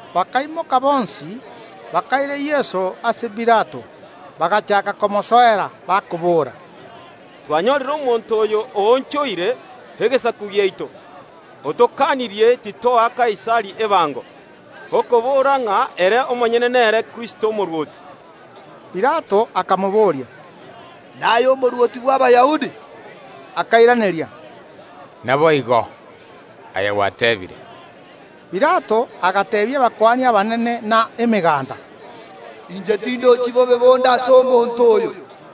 Bakaimoka bonsi, bakaira Yeso ase Pilato. Bagachaaka komosoera, bakobora, “Twanyorire omonto oyo oonchoire ense yaito, otokanirie titoa Kaisari ebango, okobora ng’a ere omonyene nere Kristo omorwoti.” Pilato akamobooria, “Naye Omorwoti bw’Abayahudi?” Yeso akaimoiraneria, “Naye gwateebire.” Pilato agateebia abakuani abanene na emeganda, “Inche tindochi komocha konde ase omonto oyo.”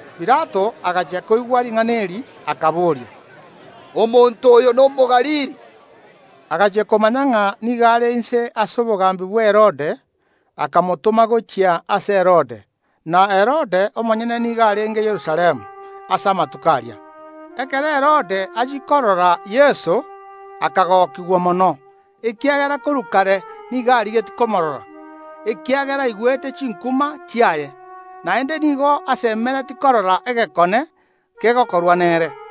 Pilato agachia koigwa ring’ana eri, akaboria, “Omonto oyo n’Omogalili?” Agachia komanya ng’a nigo are inse ase obogambi bwa Herode, akamotoma gochia ase Herode. Na Herode omonyene nigo arenge Yerusalemu ase amatuko aria. Ekero Herode achia korora Yeso akagokigwa mono, ekiagera korwa kare nigo arigetie komoorora, ekiagera aigwete chinkuma chiaye, naende nigo asemeretie korora egekone kegokorwa nere.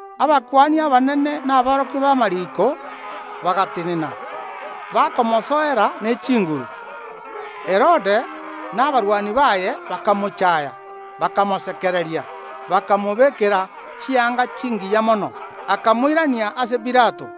Abakuani abanene na aborokia b’amariiko bagatenena, bakomosoera ne chinguru. Herode na abarwani baye bakamochaya, bakamosekereria, bakamobekera chianga chingiya mono, akamoirania ase Pilato.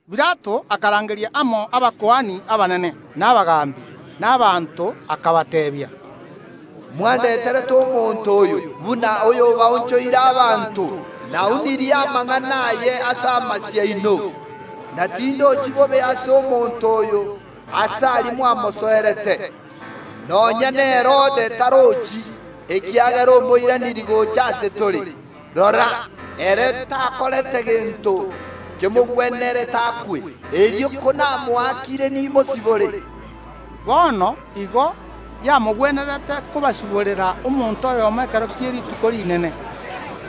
Pilato akarangeria amo abakuani abanene, na abagaambi, na abanto, akabateebia, “Mwandeterete omonto oyo, buna oyo baonchoire abanto; naunirie amang’ana aye ase amasio aino, na tindochi bobe ase omonto oyo ase aria mwamosoerete, nonya n’Herode tarochi, ekiagera omoiranirie gocha ase tore. Rora, ere takorete gento kemogwenerete akwe. Erio konamoakire, nimosibore.” Bono igo yamogwenerete kobasiborera omonto oyomo ekero kie rituko rinene.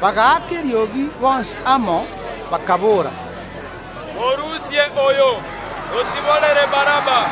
Bagaaka eriogi bonsi amo, bakaboora, “Morusie oyo, tosiborere Baraba!”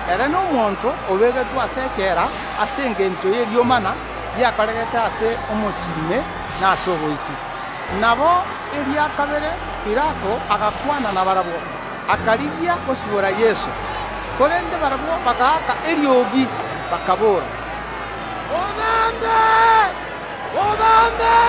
(Ere nomonto obegetwe ase echela ase engencho y’eriomana riakoregete ase omochie ime, na ase oboiti.) Nabo eria kabere Pilato agakwana nabarabwo, akarigia gosibora Yeso. Korende barabwo bagaaka eriogi, bakaboora, “Mobambe, mobambe!”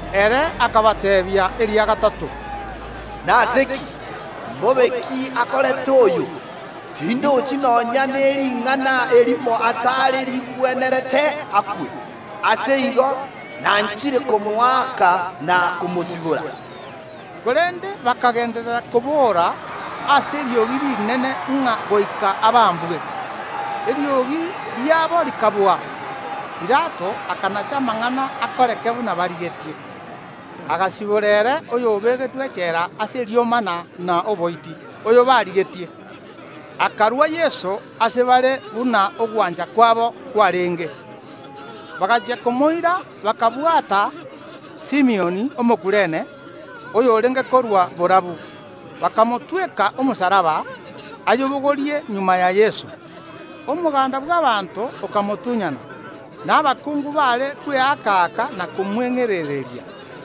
Ere akabateebia eria gatato, “Nase ki? Mbobe ki akorete oyo? Tindochi nonya ne ring’ana erimo asare rigwenerete akwe. Ase igo, nanchire komoaka na komosibora.” Korende bakagenderera kobora ase eriogi rinene ng’a goika abambwe. Eriogi riabo rikabua. Pilato akanacha amang’ana akoreke buna barigetie. Agasibora ere oyobegetwe echela ase eriomana na oboiti, oyobarigetie; akarua Yeso ase bare buna ogwancha kwabo kwarenge. Bagachia komoira, bakabwata Simioni Omokurene, oyorenge korwa borabu, bakamotweka omosalaba, ayobogorie magega ya Yeso. Omoganda bw’abaanto okamotunyana, na abakungu baare kweaka‐aka, na komweng’erereria.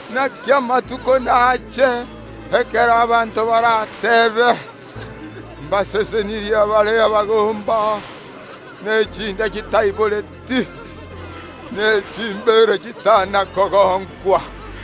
Naki amatuko naache ekero abanto barateebe: Mbasesenirie abare abagomba, ne chinda chitaiboreti, ne chimbeere chitana kogonkwa!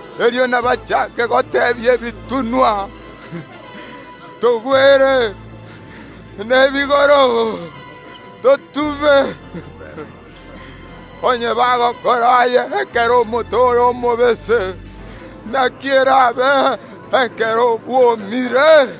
Erio nabachaake goteebia ebitunwa: Togwere, na ebigoro: Totube. Onye bagokora aya ekero omote ore omobese, naki eraabe ekero bwomire?”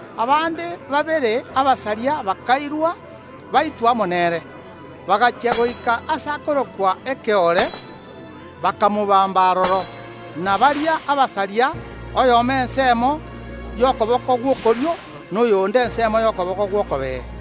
Abande babere abasaria bakairwa, baitwe amo nere. Bagachia goika aase akorokwa Ekeore, bakamobamba aroro, na baria abasaria, oyomo ensemo y’okoboko gw’okorio, na oyonde ensemo y’okoboko gw’okobee.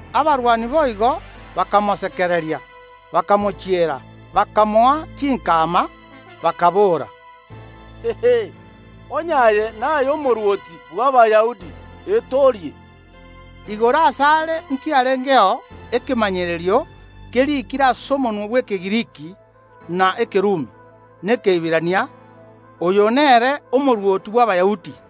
Abarwani boigo bakamosekereria, bakamochiera, bakamoa chinkama, bakaboora, “Onye aye naye Omorwoti bw’Abayahudi, etoorie.” Igoro asare nkiarengeo ekemanyererio keriikire ase omonwa bw’Ekegiriki, na Ekerumi, na Ekeiberania “OYO NERE OMORWOTI BW’ABAYAHUDI.”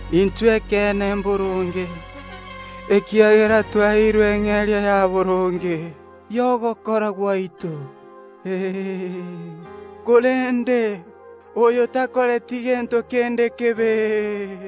Intwe ekeene mboronge; ekiagera twaeirwe eng’eria ya boronge y’ogokora gwaito, korende oyo takoreti gento kende kebe.”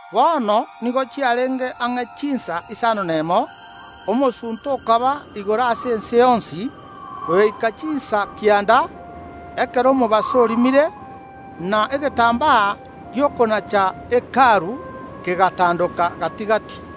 Bono nigo chiarenge ang’e chinsa isano nemo, omosunte okaba igoro ase ense yonsi goika chinsa kianda, ekero omobaso orimire. Na egetambaa gi’okonacha Hekalu kegatandoka gati‐gati.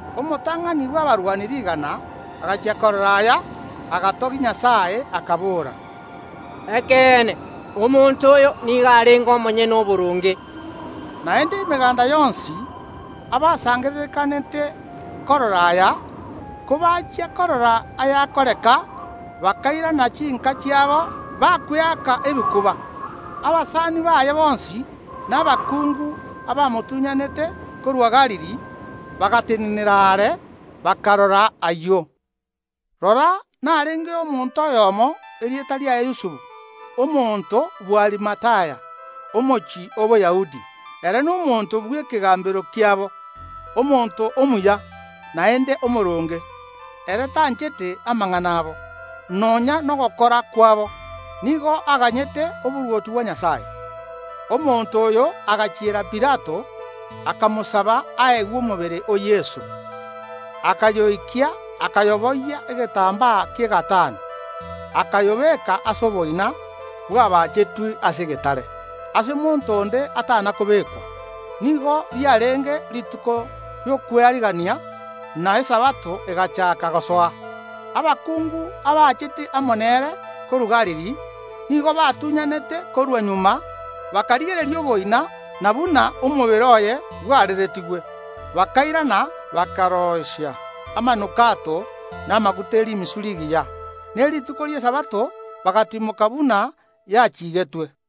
Omotang’ani bw’abarwani rigana agachia korora aya, agatogia Nyasae, akabora, “Ekeene, omonto oyo nigo arenge omonyene oboronge.” Naende emeganda yonsi, abasangererekanete korora aya, kobachia korora ayakoreka, bakairana chinka chiabo, bakweaka ebikuba. Abasani baye bonsi na abakungu abamotunyanete korwa Galili, bagatenenera are, bakarora ayio. Rora, narengeo omonto oyomo, erieta riaye Yusufu, omonto bw’Arimathaya, omochie o Boyahudi, ere nomonto bw’ekegambero kiabo, omonto omuya, naende omooronge. Ere tanchete amang’ana abo, nonya nogokora kwabo, nigo aganyete oborwoti bwa Nyasae. Omonto oyo agachiera Pilato, akamosaba aegwe omobere o Yeso. Akayoikia, akayoboyia egetambaa ki’egatani, akayobeeka ase oboina bwabaachetwe ase egetare, aase monto onde atana kobekwa. Nigo riarenge rituko ri’Okwearigania, na Esabato egachaaka gosoa. Abakungu abaachete amo nere korwa Galili, nigo batunyanete korwa magega, bakarigereria oboina na buna omobere oye bwareretigwe. Bakairana, bakaroisia amanukato na amaguta ye rimisu rigiya. Ne rituko ri’Esabato bagatimoka buna yachiigetwe.